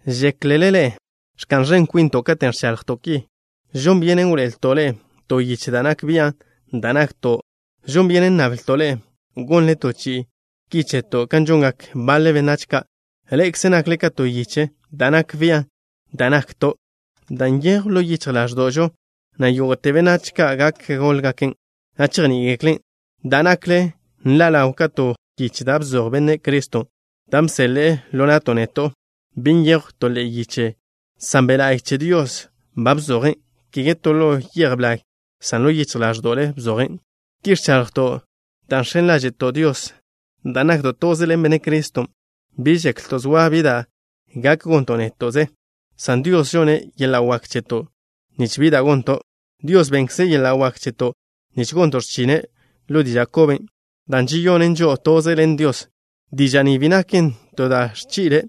¿Žéklele ḻe'e ẕka'n ẕen kwinto' katen' ẕchaḻjto' ki? ¿Žon byenen wḻoe'elto' ḻe'e to yiche da' nak bian' da' nakto'? ¿Žon byenen nnablto' ḻe'e gonnle to yiche ki cheto' kan žongak baḻe benách ka'? Ḻe'ekze nakle ka to yiche da' nak bian' da' nakto', dan' nyejwn ḻo yichj ḻáẕdo'žo, na' yógo'te benách gak góḻgaken', na' chejní'igeklen'. Da' nakle nḻa' ḻaw ka to yiche da' bzoj Benne' Criston', dan' bseḻe'e ḻo na'to' neto'. Bi nyejw to ḻe'e yiche, san Be' La'y che Dios ban bzojen', kege to ḻo yej blag, san ḻo yichj ḻáẕdo'le bzojen'. Ki ẕchaḻjto' dan' žx̱en ḻáže'to' Dios dan' nakto' toze ḻen Benne' Criston'. Bi žeklto' zoa bi da' gak gonto' néto'ze, san Dios žonne' yeḻa' wak cheto' nich bi da' gonto'. Dios bennkze' yeḻa' wak cheto' nich gonto' x̱chine' ḻo diža' koben', da' žeyonen žo'o toze ḻen Dios. Diža' ni bi naken to da' ẕchi'le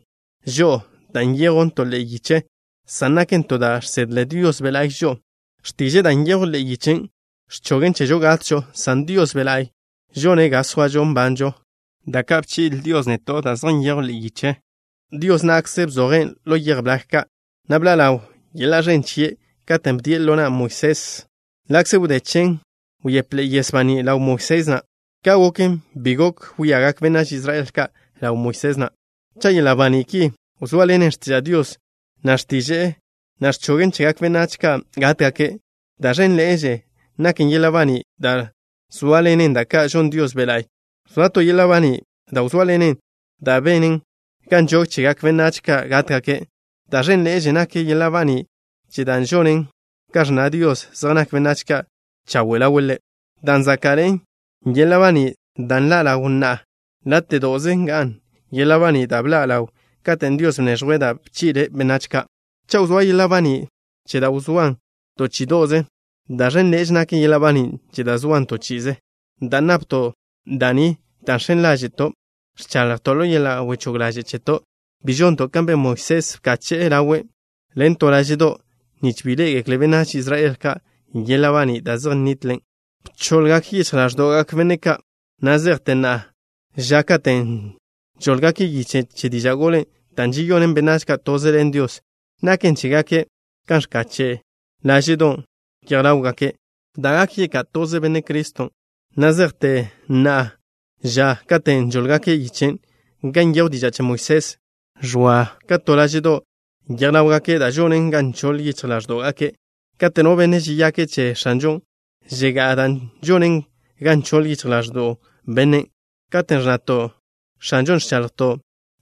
žo'o da' nyejwn to ḻe'e yiche, san naken to da' žsedle Dios Be' La'y žo'o. X̱tiže'e da' nyejwn ḻe'e yichen' ẕchogen chežo gatžo, san Dios Be' La'y žone' ga zoažo nbanžo. Da' ka' bchi'le Dios neto' da' zej nyejwn ḻe'e yiche, Dios na'kze bzojen' ḻo yej blag ka', na' bḻa' ḻaw yeḻa' ẕen chie' katen' bdien' ḻo na' Moisés. Ḻa'kze wdé chen, wyepḻe'e yes banín' ḻaw Moisés na'. Ka' goken, bi gok wíagak benách Israel ka' ḻaw Moisés na'. Cha' yeḻa' baní' ki wzóaḻenen x̱tiža' Dios, na' x̱tiže'e na' ẕchogen chegak benách ka' gátgake', da' ẕénḻe'eže nak yeḻa' baní' da' zóaḻenen da' ka' žon Dios Be' La'y. Wzóa to yeḻa' baní' da' wzóaḻenen dan' benen ga nžog chegak benách ka' gátgake'. Da' ẕénḻe'eže nak yeḻa' baní' che da' žonen ga ẕnna Dios zej nak benách ka' chawe' ḻawe' Ḻe'. Dan' záka'ḻe'e yeḻa' baní' da' nḻa' ḻawn na'a, láte'do'ze nga'n yeḻa' baní' da' bḻa' ḻawn katen' Dios bneẕjwe' da' bchi'le' benách ka'. Cha' wzóa yeḻa' baní' che da' wzóan to chí'ido'ze, da' ẕénḻe'eže nak yeḻa' baní' che da' zoan to chi'ize. Dan' napto' da' ni da' žx̱en ḻáže'to', ẕchaḻjto' ḻo yeḻa' wechóg ḻaže' cheto'. Bi žonto' kan ben Moisés, bkache'e ḻawe' ḻen to láže'do', nich bi ḻé'egekle benách Israel ka' yeḻa' baní' da' zej ẕnitlen. Bchoḻgak yichj ḻáẕdo'gak benne' ka'. Na' zejte na'a ža katen' žóḻgake' yiche che diža' golen' da' žeyonen benách ka' toze ḻen Dios, naken chégake' kan ẕkache' láže'don' yej ḻáwgake', da' gak yeká' toze Benne' Criston'. Na' zejte na'a ža, katen' žóḻgake' yichen' gan nyejw diža' che Moisés, ẕoa ka to láže'do' yej ḻáwgake' dan' žonen ga nchoḻ yichj ḻáẕdo'gake'. Kate' no benne' žeyake' che X̱anžon', žegá'a dan' žonen ga nchoḻ yichj ḻáẕdo'w bennen'. Katen' ẕnnato' “X̱anžo” ẕchaḻjto'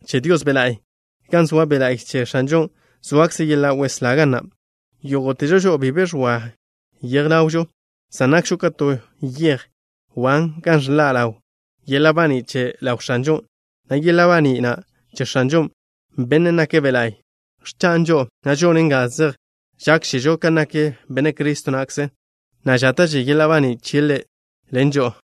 che Dios Be' La'y. Gan zoa Be' La'y che X̱anžon', zoakze yeḻa' weslá ga na'. Yógo'težo žo'o bi be ẕoa yej ḻawžo, san nakžo ka to yej wan gan ẕḻa' ḻaw yeḻa' baní' che ḻaw X̱anžon', na' yeḻa' baní' na' che X̱anžon', Bennen' nake' Be' La'y, ẕchan' žo'o, na' žonen ga zej žákžežo kan nak Benne' Cristo na'kze, na' žáta'že yeḻa' baní' chie' ḻen žo'o.